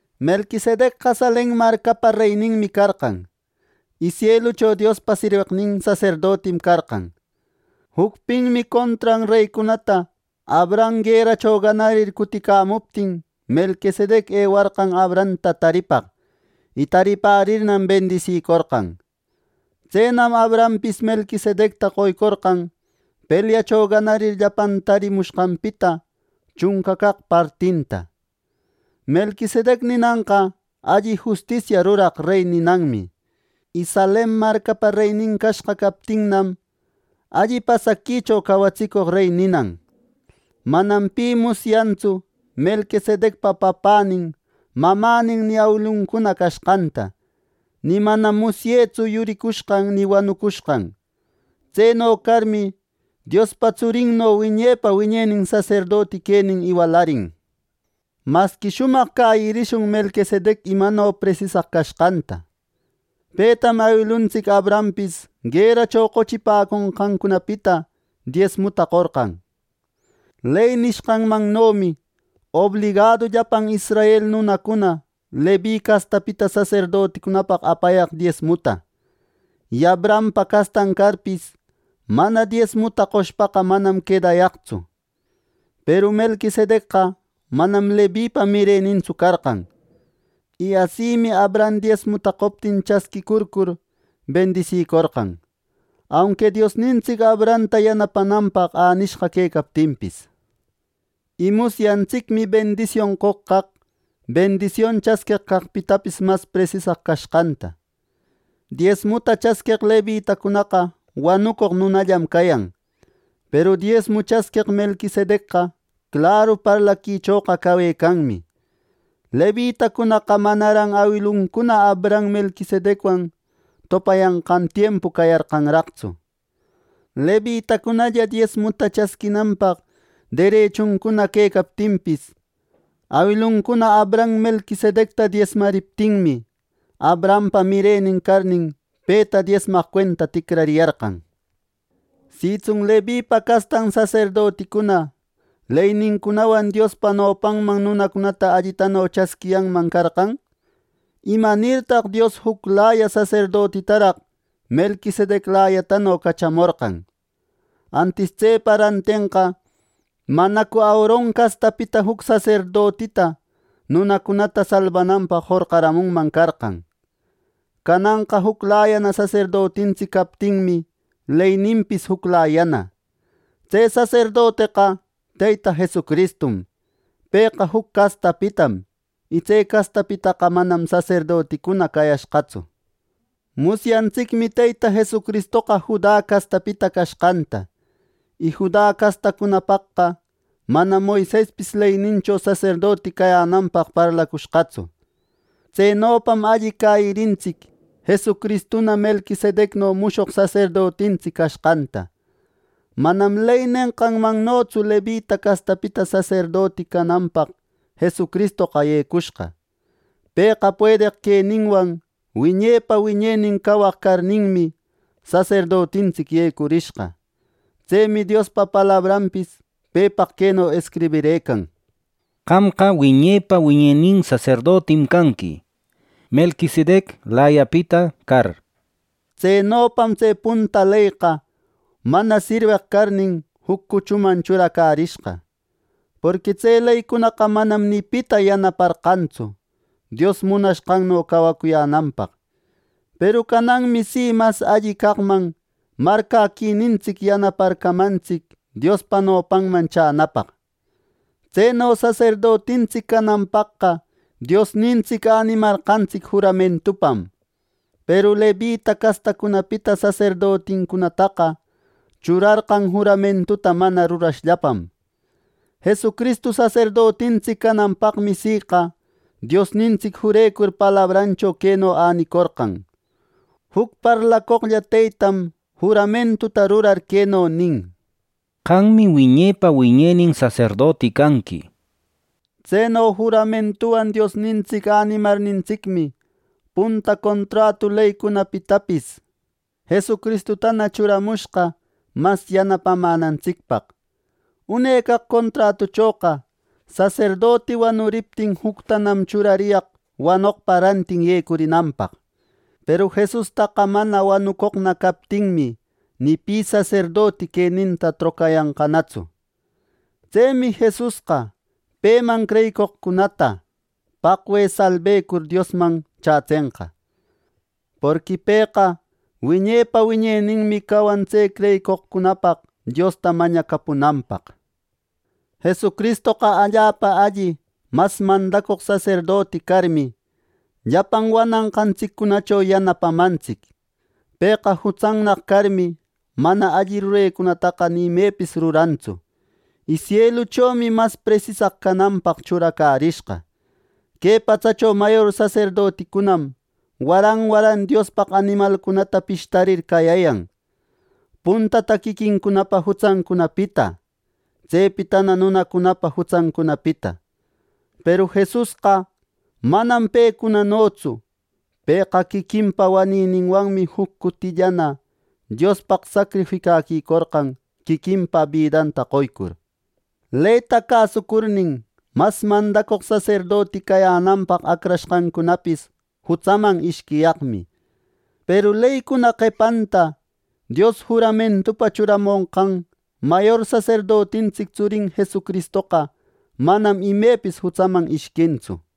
Melquisedecqa Salem marcapa reyninmi carqan, y sielucho Diospa sirweqnin saserdotim carqan. Jucpinmi contran reycunata Abraham gueracho ganarir cuticamuptin, Melquisedec ewarqan Abrahamta taripaq; y taripärirnam, bendisicorqan Tsenam Abrahampis Melquisedecta qoycorqan pelyacho ganarir llapan taripacamushqanpita chunca caq partinta. Melquisedec ninanqa “Alli justisia ruraq rey” ninanmi, y Salem marcapa reynin cashqa captinnam, “Alli pasaquicho cawatsicoq rey” ninan. Manam pi musyantsu Melquisedecpa papänin mamänin ni awiluncuna cashqanta, ni manam musyetsu yuricushqan ni wanucushqan. Tseno carmi, Diospa Tsurinno wiñepa wiñenin saserdoti quenin iwalarin. Masqui shumaq cäyirishun Melquisedec imano presisaq cashqanta. Petam awiluntsic Abrahampis gueracho qochipaconqancunapita diesmuta qorqan. Ley nishqanmannomi obligadu llapan israel nunacuna Levi castapita saserdoticunapaq apayaq diesmuta; y Abrahampa castan carpis, mana diesmuta qoshpaqa manam quedayaqtsu. Peru Melquisedecqa manam Levipa mirenintsu carqan, y asimi Abraham diesmuta qoptin chasquïcurcur, bendisïcorqan, aunqui Diosnintsic Abrahamta yanapananpaq änishqana quecaptinpis. Y musyantsicmi bendision qoq caq, bendision chasqueq caqpitapis mas presisaq cashqanta. Diesmuta chasqueq Levitacunaqa wanucoq nunallam cayan; peru diesmu chasqueq Melquisedecqa claru parlaquichoqa cawecanmi. Levitacunaqa manaran awiluncuna Abraham Melquisedecwan topayanqan tiempu cayarqanraqtsu; Levitacunalla diesmuta chasquinanpaq derechuncuna quecaptinpis, awiluncuna Abraham Melquisedecta diesmariptinmi, Abrahampa mirenin carnin, peta diesmaq cuenta ticrariyarqan. Sitsun Levipa castan saserdoticuna leynincunawan Diospa nopanman nunacunata allitano chätsiyanman carqan, ¿imanirtaq Dios juclaya saserdotitaraq Meliquisedeclayatano cachamorqan! Antis tsepa rantenqa ¿manacu Aaron castapita juc saserdotita nunacunata salbananpaq jorqaramunman carqan! Cananqa juclayana saserdotintsic captinmi, leyninpis juclayana. Tse saserdoteqa Teyta Jesucristum. Pëqa juc castapitam. Y tse castapitaqa manam saserdoticuna cayashqatsu. Musyantsicmi Teyta Jesucristoqa Juda castapita cashqanta, y Juda castacunapaqqa manam Moisespis leynincho saserdoti cayänanpaq parlacushqatsu. Tsenopam alli cäyirintsic Jesucristuna Melquisedecno mushoq saserdotintsic cashqanta. Manam ley nenqanmannotsu Levita castapita saserdoti cananpaq Jesucristoqa yecushqa. Pëqa puedeq queninwan wiñepa wiñenin cawaq carninmi, saserdotintsic yecurishqa. Tsemi Diospa palabranpis pepaq queno escribirëcan: “Qamqa wiñepa wiñenin saserdotim canqui Melquisedeclayapita car” nir. Tsenopam tse punta leyqa mana sirweq carnin, juc cuchuman churacärishqa. Porqui tse leycunaqa manam ni pita yanaparqantsu Dios munashqanno cawacuyänanpaq; peru cananmi si mas alli caqman marcäquinintsic yanaparqamantsic Diospa nopanman chänäpaq. Tseno saserdotintsic cananpaqqa Diosnintsic änimarqantsic juramentupam. Peru Levita castacunapita saserdoticunataqa churarqan juramentuta mana rurashllapam. Jesucristu saserdotintsic cananpaqmi siqa Diosnintsic jurecur palabrancho queno änicorqan: “Juc parlacoqlla Teytam juramentuta rurar queno nin: ‘Qammi wiñepa wiñenin saserdoti canqui’” nir. Tseno juramentuwan Diosnintsic änimarnintsicmi punta contratu leycunapitapis Jesucristutana churamushqa mas yanapamänantsicpaq. Une caq contratuchoqa saserdoti wanuriptin juctanam churariyaq wanoqpa rantin yecunanpaq. Peru Jesustaqa mana wanucoqna captinmi, ni pi saserdoti queninta trocayanqanatsu. Tsemi Jesusqa, peman creyeqcunata paqwe salbecur Diosman chätsenqa. Porqui pëqa wiñepa wiñeninmi cawan tse creyicoqcunapaq Diosta mañacapunanpaq. Jesucristoqa allapa alli mas mandacoq saserdoti carmi, llapan wananqantsicunacho yanapamantsic. Pëqa jutsannaq carmi, mana alli rurecunataqa ni imepis rurantsu, y sieluchomi mas presisaq cananpaq churacärishqa. Que patsacho mayor saserdoticunam waran waran Diospaq animalcunata pishtarir cayäyan; puntata quiquincunapa jutsancunapita, tsepitana nunacunapa jutsancunapita; peru Jesusqa manam pecunanotsu. Pëqa quiquinpa wanïninwanmi juc cutillana Diospaq sacrificäquicorqan quiquinpa bidanta qoycur. Leyta cäsucurnin, mas mandacoq saserdoti cayänanpaq acrashqancunapis jutsaman ishquiyaqmi; peru leycuna qepanta Dios juramentupa churamonqan mayor saserdotintsic tsurin Jesucristoqa manam imepis jutsaman ishquintsu.